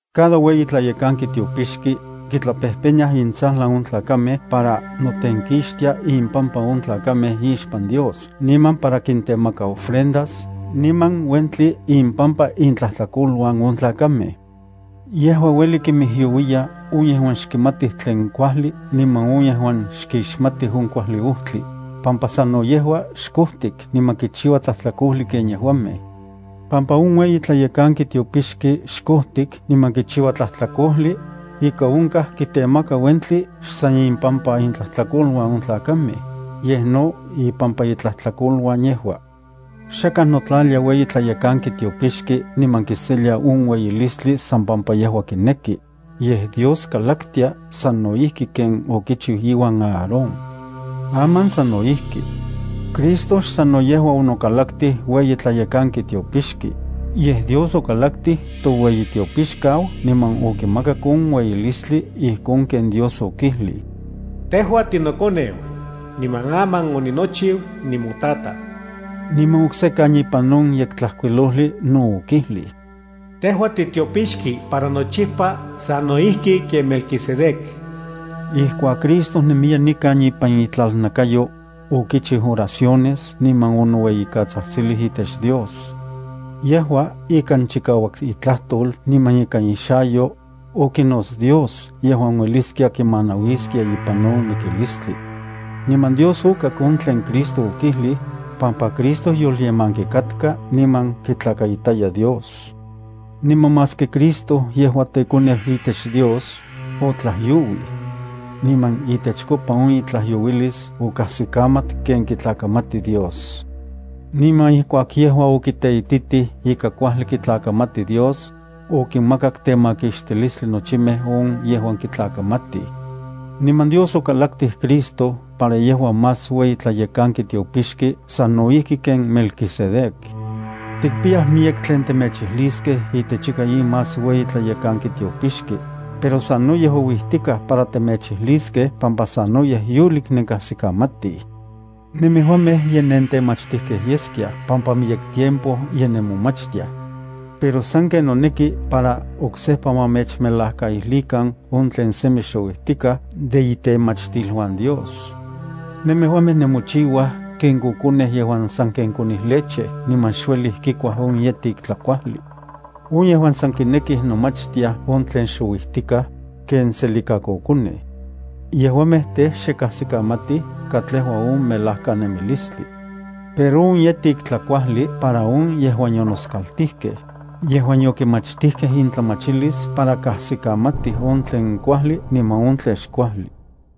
Cada ueyi tlayekanki tiopixki tlayekanki kitlapejpeniaj intsajlan on tlakamej para notenkixtia impampa on tlakamej ixpan Dios niman para kintemaka ofrendas niman uentli impampa intlajtlakoluan on tlakamej. Yejua ueli kinmijyouiya on yejuan xkimatij tlen kuajli niman on yejuan xkixmatij on kuajli niman on yejuan xkotkaj kuajli ojtli, pampa sano yejua xkojtik niman kichijua tlajtlakojli ken yejuamej. Pampa on ueyi tlayekanki tiopixki xkojtik niman kichiua tlajtlakojli, ika onkaj kitemaka uentli xsan impampa intlajtlakoluan on tlakamej, yej no ipampa itlajtlakoluan yejua. Xakaj notlalia ueyi tlayekanki tiopixki niman kiselia on ueyilistli san pampa yejua kineki, yej Dios kikalaktia sano ijki ken okichiu iuan Aarón. Aman sano ijki. Cristo xsano yejua onokalaktij ueyi tlayekanki tiopixki, yej Dios okalaktij toueyitiopixkau niman okimakak on ueyilistli ijkon ken Dios okijlij: Tejua tinokoneu, niman aman oninochiu nimoTataj. Niman oksekan ipan on Yektlajkuilojli no okijlij: Tejua titiopixki para nochipa sano ijki ken Melquisedec. Ijkuak Cristo nemiya nikan ipan itlalnakayo, okichiu oraciones niman onoueyikatsajtsilij itech Dios. Yejua ikan chikauak itlajtol niman ikan ixayo, okinots Dios yejuan ueliskia kimanauiskia ipan on mikilistli. Niman Dios okak on tlen Cristo okijlij, pampa Cristo yolyemanki katka niman kitlakaitaya Dios. Niman maski Cristo yejua teKoneu itech Dios, otlajyouij. Niman itechkopa on itlajyouilis okajsikamat ken kitlakamati Dios. Niman ijkuak yejua okiteititij ika kuajli kitlakamati Dios, okinmakak temakixtilistli nochimej on yejuan kitlakamatij. Niman Dios okitlakalaktij Cristo para yejua más ueyi tlayekanki tiopixki sano ijki ken Melquisedec. Tikpiyaj miyek tlen temechijliskej itech ika in más ueyi tlayekanki tiopixki, pero sanoyej ouijtikaj para temechijliskej pampa sanoyej yolik nenkajsikamatij. Nemejuamej ye nentemachtijkej yeskiaj pampa miyek tiempo ye nemomachtiaj. Pero sanken noneki para oksejpa ma mechmelajkaijlikan on tlen semi xouijtikaj de itemachtiluan Dios. Nemejuamej nemochiuaj ken kokonej yejuan sanken konij leche niman xuejli kikuaj on yetik tlakuajli. On yejuan san kinekij nomachtiaj on tlen xouijtikaj, ken tselikakokonej. Yejuamej tej, xe kajsikamatij katlejua on melajkanemilistli. Pero on yejtik tlakuajli para on yejuan yonoskaltijkej, yejuan yokimachtijkej intlamachilis para kajsikamatij on tlen kuajli niman on tlen xkuajli.